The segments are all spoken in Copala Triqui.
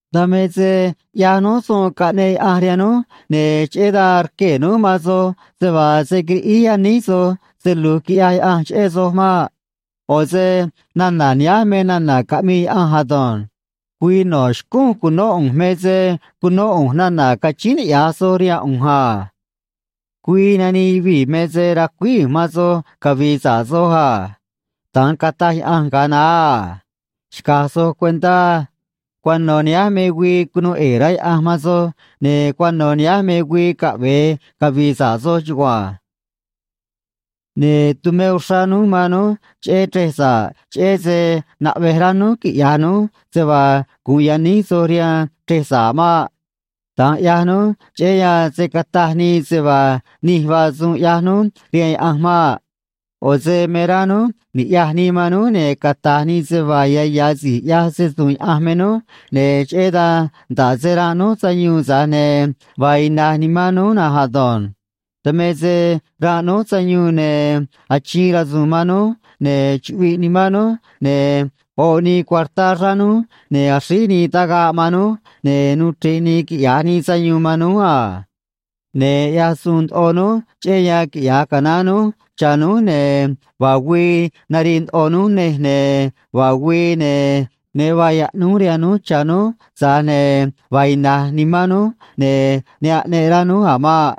Dan me se ꞌyaj núj suun caꞌneꞌ Yaꞌanj rihaan núj, ne̱ cheꞌé dan rquee̱ núj man soj se vaa se̱ quiriꞌíj yaníj soj se lu̱j quiꞌyaj Yaꞌanj cheꞌé soj maꞌ. ꞌO̱ se nana̱ nihánj me nana̱ caꞌmii Yaꞌanj ado̱nj: Güii no̱ xcúún cu̱nó ꞌu̱nj me se cunó ꞌu̱nj nana̱ cachíín niꞌya̱j soj rihaan ꞌu̱nj a. Güii nanii yuvii̱ me se racuíj ꞌu̱nj man soj cavi̱i̱ sa̱ꞌ soj a. Da̱nj cataj Yaꞌanj ga̱a naá a. Xca̱j soj cuentá á. Cuano̱ nihánj me güii cunuu ꞌe̱e̱ rá Yaꞌanj man soj, ne̱ cuano̱ nihánj me güii caꞌve̱e cavi̱i̱ sa̱ꞌ soj chugua̱nj. Ne̱ tumé uxrá núj man núj cheꞌé chrej sa̱ꞌ, cheꞌé se naꞌvej rá núj quiꞌya̱j núj se vaa gu̱un yaníj soj rihaan chrej sa̱ꞌ maꞌ. Da̱nj ꞌyaj núj cheꞌé yan se̱ cata̱j nii se vaa nij vaa suun ꞌyaj núj rihaan Yaꞌanj maꞌ. ꞌO̱ se me rá núj ni̱ꞌyaj nii man núj ne̱ cata̱j nii se vaa ya̱ ya̱ si̱j ꞌyaj se‑su̱u̱n Yaꞌanj me núj, ne̱ cheꞌé dan nda̱ꞌ se ranꞌ núj sayuun, tza̱j ne̱ vaa ina̱j nimán núj na̱nj ado̱nj. Dan me se ranꞌ núj sayuun, ne̱ achiin rasu̱u̱n man núj, ne̱ chuꞌviꞌ nimán núj, ne̱ oꞌ nii cuartá xráá núj, ne̱ axríj nii tagaꞌ man núj, ne̱ nuu chre̱ꞌ nii quiꞌya̱j nii sayuun man núj a. Ne̱ ꞌyaj suun ndoꞌo núj cheꞌé yan quiꞌya̱j canaán núj cha̱ núj, ne̱ vaa güii narii ndoꞌo núj nej, ne̱ vaa güii, ne̱ ne vaa yaꞌnúj rihaan núj cha̱ núj, tza̱j ne̱ vaa ina̱j nimán núj, ne̱ ne aꞌneꞌ rá núj a̱ maꞌ.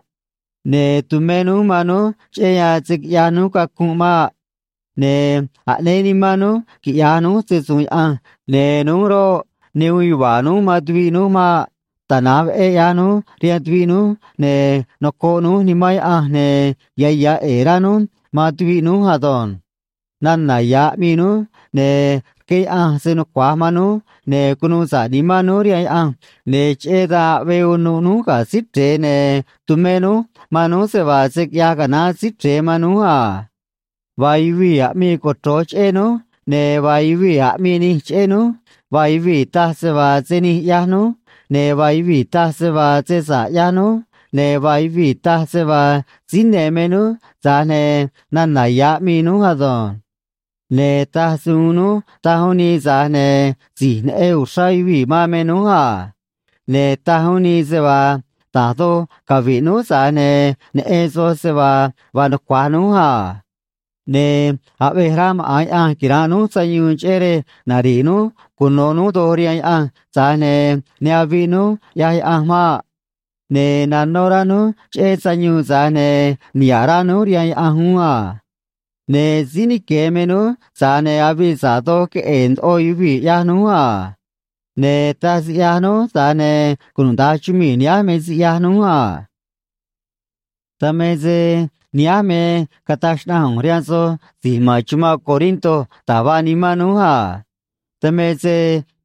Ne̱ tumé núj man núj cheꞌé yan se̱ quiꞌyaj núj cacunꞌ maꞌ. Ne̱ aꞌnéé nimán núj quiꞌya̱j núj se‑su̱u̱n Yaꞌanj, ne̱ núj roꞌ, ne uun yuva̱a̱ núj man tuviꞌ núj maꞌ. Tana̱nj veꞌé ꞌyaj núj rihaan tuviꞌ núj, ne̱ noco̱ꞌ núj Nimán Yaꞌanj, ne̱ ya̱ ya̱ ꞌe̱e̱ rá núj man tuviꞌ núj ado̱nj. Nana̱ ya̱ aꞌmii núj, ne̱ rqué Yaꞌanj se nucua̱j man núj, ne̱ cunuu sa̱ꞌ nimán núj rihaan Yaꞌanj, ne̱ cheꞌé dan aꞌvee unuꞌ núj ga̱ Síí Chre̱e, ne̱ tumé núj man núj se vaa se̱ quiꞌyaj canaán Síí Chre̱e man núj a. Vaa yuvii̱ aꞌmii cochro̱j cheꞌé núj ne̱ vaa yuvii̱ aꞌmii nij cheꞌé núj, vaa yuvii̱ taj se vaa se nij ꞌyaj núj ne̱ vaa yuvii̱ taj se vaa se sa̱ꞌ ꞌyaj núj, ne̱ vaa yuvii̱ taj se vaa síí ne̱ me núj, tza̱j ne̱ nana̱ ya̱ aꞌmii núj ado̱nj. Ne̱ taj se uun núj, taj uún nii, tza̱j ne̱ si̱j neꞌen uxrá yuvii̱ man me núj a. Ne̱ taj uún nii se vaa da̱j doj cavi̱ꞌ núj, tza̱j ne̱ neꞌen soj se vaa vaa nucua̱j núj a. Ne̱ aꞌvej rá maꞌa̱n Yaꞌanj quira̱nꞌ núj sayuun cheꞌé rej nari̱ꞌ núj cuno̱ núj doj rihaan Yaꞌanj, tza̱j ne̱ ne aviꞌ núj, ꞌyaj Yaꞌanj maꞌ. Ne̱ nanó rá núj cheꞌé sayuun, tza̱j ne̱ niha̱ꞌ rá núj rihaan Yaꞌanj uún a. Ne̱ síí nique̱ me núj, tza̱j ne̱ avii sa̱ꞌ doj queꞌe̱e̱ ndoꞌo yuvii̱, ꞌyaj núj a. Ne̱ taj siꞌyaj núj, tza̱j ne̱ cunuda̱nj chumii̱ nihánj me siꞌyaj núj a. Dan me se nihánj me cataj xnaꞌanj ꞌu̱nj rihaan soj si̱j ma̱n chumanꞌ Corinto da̱j vaa nimán núj a. Dan me se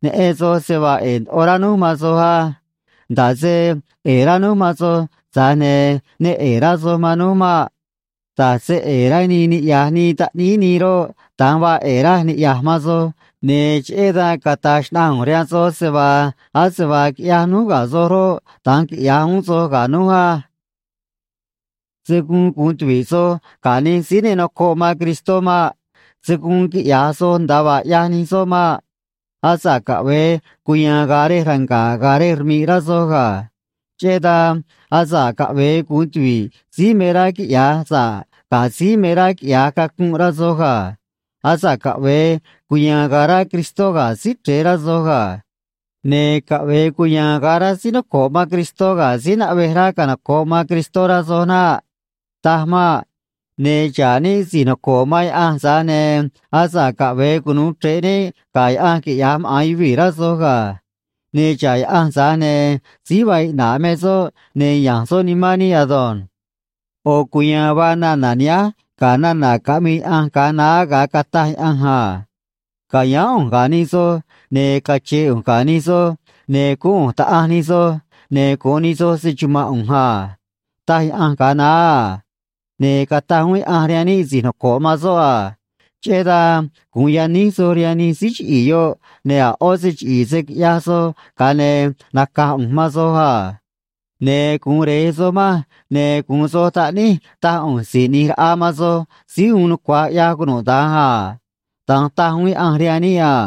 neꞌen soj se vaa ꞌe̱e̱ ndoꞌo rá núj man soj á. Nda̱ꞌ se ꞌe̱e̱ rá núj man soj, tza̱j ne̱ ne ꞌe̱e̱ rá soj man núj maꞌ. Da̱j se ꞌe̱e̱ rá nii niꞌya̱j nii taꞌníí nii roꞌ, da̱nj vaa ꞌe̱e̱ raj niꞌya̱j man soj, ne̱ cheꞌé dan cata̱j xnaꞌanj ꞌu̱nj rihaan soj se vaa, ase vaa quiꞌyaj núj ga̱ soj roꞌ, da̱nj quiꞌya̱j uún soj ga̱ núj á. Se̱ guun gu̱un tuvi̱ꞌ soj ga̱ nij síí ne nocoꞌ man Cristó maꞌ. Se̱ guun quiꞌya̱j soj nda̱a vaa ꞌyaj nij soꞌ maꞌ. Asa̱ꞌ caꞌve̱e cuya̱a̱n ga̱a̱ rej ranga̱ꞌ ga̱ rej rmi̱ꞌ, rá soj ga̱. Cheꞌé dan, asa̱ꞌ caꞌve̱e gu̱un tuvi̱ꞌ síí me rá quiꞌya̱j sa̱ꞌ ga̱ síí me rá quiꞌya̱j cacunꞌ, rá soj ga̱. Asa̱ꞌ caꞌve̱e cuya̱a̱n ga̱a̱ rá Cristó ga̱ Síí Chre̱e, rá soj ga̱. Ne̱ caꞌve̱e cuya̱a̱n ga̱a̱ rá síí noco̱ꞌ man Cristó ga̱ síí naꞌvej rá canoco̱ꞌ man Cristó, rá soj naꞌ. Taj maꞌ. Ne̱ xa̱ꞌ níꞌ si̱j noco̱ꞌ man Yaꞌanj, tza̱j ne̱ asa̱ꞌ caꞌve̱e cunu̱u chre̱ꞌ níꞌ ga̱ yaꞌanj quiꞌyaj maꞌa̱n yuvii̱, rá soj ga̱. Ne̱ xa̱ꞌ Yaꞌanj, tza̱j ne̱ síí vaa iꞌna̱ꞌ me soꞌ, ne̱ ya̱nj soꞌ nimán níꞌ ado̱nj. ꞌO̱ cuya̱a̱n vaa nana̱ nihánj ga̱ nana̱ caꞌmii Yaꞌanj ga̱a naá ga̱a cataj Yaꞌanj a: Ca̱yáán ꞌu̱nj ga̱ nij soꞌ, ne̱ cache̱e̱ ꞌu̱nj ga̱ nij soꞌ, ne̱ guún ꞌu̱nj Taꞌanj nij soꞌ, ne̱ gu̱un nij soꞌ se‑chuma̱nꞌ ꞌu̱nj a, taj Yaꞌanj ga̱a naá a. Ne̱ cataj uún Yaꞌanj rihaan níꞌ si̱j noco̱ꞌ man soꞌ a: Cheꞌé dan gu̱un yaníj soj rihaan nij síí chiꞌi̱i̱ yoꞌ, ne̱ a̱ ꞌó se chiꞌi̱i̱ se̱ quiꞌyaj soj, ga̱a ne̱ naca̱j ꞌu̱nj man soj a. Ne̱ gu̱un Re̱j soj manj, ne̱ gu̱un soj taꞌníj, taj ꞌu̱nj Si̱j ꞌNi̱j Raꞌa man soj Síí Uun Nucua̱j ꞌYaj Cunuda̱nj a. Da̱nj taj uún Yaꞌanj rihaan níꞌ a.